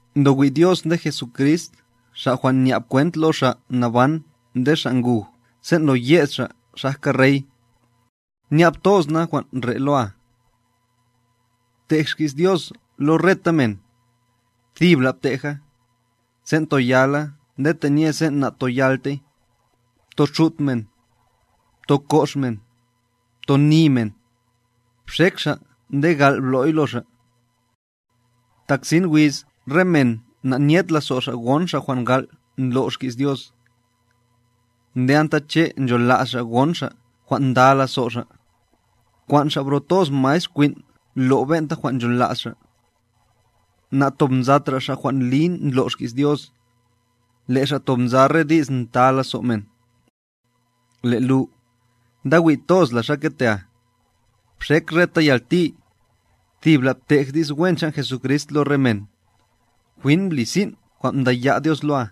Ndowi' Dios nde Jesucrist Xa' jwan' nya'b kwent lo xa' naban nde xa' nguj sen' lo yed xa' xajka Rey, nya'b toz na jwan' re' loa. Btej xki's Dios lo reta men, thibla' bteja, sen' toyala nde tenye sen' natoyaltey, ptoxut men, ptokox men, ptoni men, bxek xa' nde gal' blo'y lo xa'. Tak sin wiz re men na'nyed lazo' xa' gon xa' jwan' gal' ndlo' xkis Dios, nde anta che' nchola's xa' ngon xa' jwan' nda lazo' xa', kwan' xa' bro toz maestr kwin' lo' ben'ta jwan' nchola's xa'. Na'tobnzatra' xa' jwan' li ndlo' xkis Dios, le' xa' tob nza re di's nta lazo' men. Le' lu, ndawi' toz la xa ketea, bxek reta yalti, thibla btej dis wen chan' Jesucrist lo re men, jwin bli sin' jwan' mdaya' Dios loa.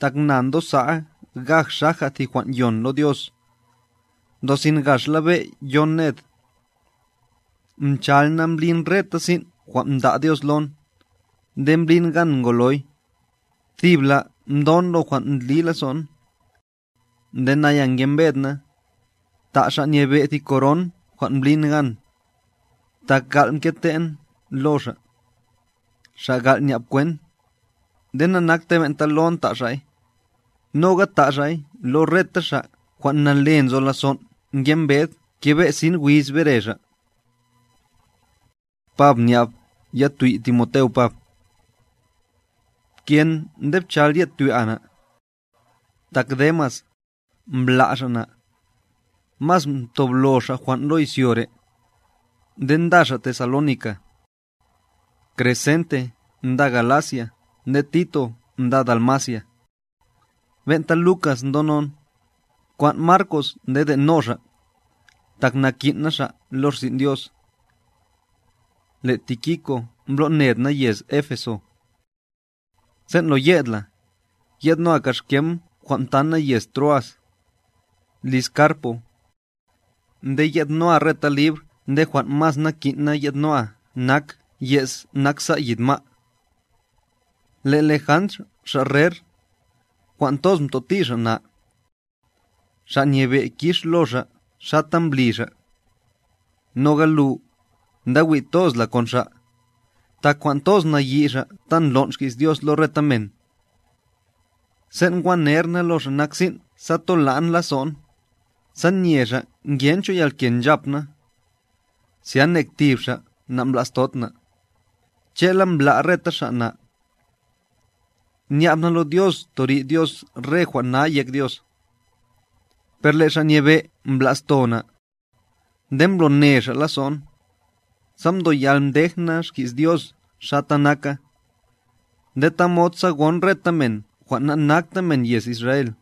Tak na ndosa'a gaj xaja thi jwan' yon lo Dios, ndosin gaxla be' yon ned. Mchal na mblin reta sin' jwan' mda' Dios lon, nde mblin gan ngoloy, thibla mdon lo jwan' ndli lazo'n. Nde naya ngembed na, ta' Xa' Nyebe' thi koron jwan' mblin gan, tak gal' mkete'n lo Xa', Xa' gal' nya'b kwent, nde nanaktey ben'ta lon ta' Xa'y, noga ta' Xa'y lo reta xa' jwan' nale nzo lazon' ngembed kebe' sin wiz bere Xa'. Pab nya'b yatwi Timoteo Pab. Pken nde pchal ye'd twi'a na. Tak Demas, mbla' xa' na, mas mtoblo xa' jwan' lo izyo re', nde nda xa' Tesalónica. Crescente nda Galacia nde Tito nda Dalmacia. Ben'ta Lucas ndonon, bkwan' Marcos nde de'no xa', tak nakin' na xa' lo rsin' Dios. Le' Tíquico mbloned na yez Éfeso. Sen' lo ye'd la, ye'dnoa kaxkem jwan' mtan na yez Troas, liz Carpo, nde ye'dnoa reta libr nde jwan' mas nakin'na ye'dnoa nak yez naksa' yid ma'a. Le' Lejandr xa' rer, jwan' toz mtoti xa' na. Xa' Nyebe' kix lo xa' xata mbli xa'. Noga lu, ndawi' toz la kon xa', tak jwan' toz nayi' xa' ta ndlon' xki's Dios lo reta men. Sen' ngwa ner na lo xa' nak sin' sa tola'n lazo'n, sa nye xa' ngencho yalke nchap na, zya nek tib xa' na'mblastod na, che'la mbla' reta xa' na. Nya'b na lo Dios torid Dios re jwan' na yek Dios. Per le' Xa' Nyebe' mbla'sto na, nde mblone Xa' lazo'n, sa mdoyal mdej na xki's Dios xata naka, nde tamod sa gon reta men jwan' nanakta men yez Israel.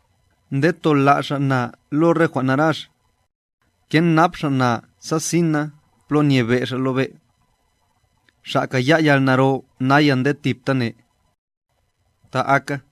nde tola' Xa' na lo re jwan' narax, kenap Xa' na sa sin na plo nyebe' Xa' lo be'. ¡Xa' kaya' yalnaro naya nde thibtane! Ta aka.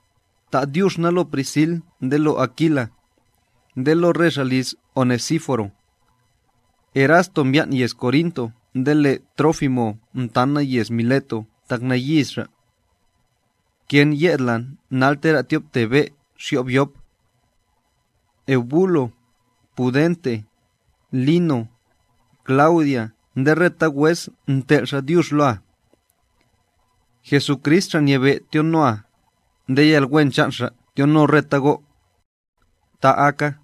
Ta' dyux na lo Prisil nde lo Akila, nde lo re xa' liz Onesíforo. Erasto mbyan' yez Corinto nde le' Trófimo mtan na yez Mileto tak nayis xa'. Pken ye'd la nal tera' tyobte be' xyo'b yop. Eubulo, Pudente, Lino, Claudia nde reta wes ntel' xa' dyux loa. Jesucrist Xa' Nyebe' tyonoa, nde yalwen chan' Xa' tyono reta go'. Ta aka.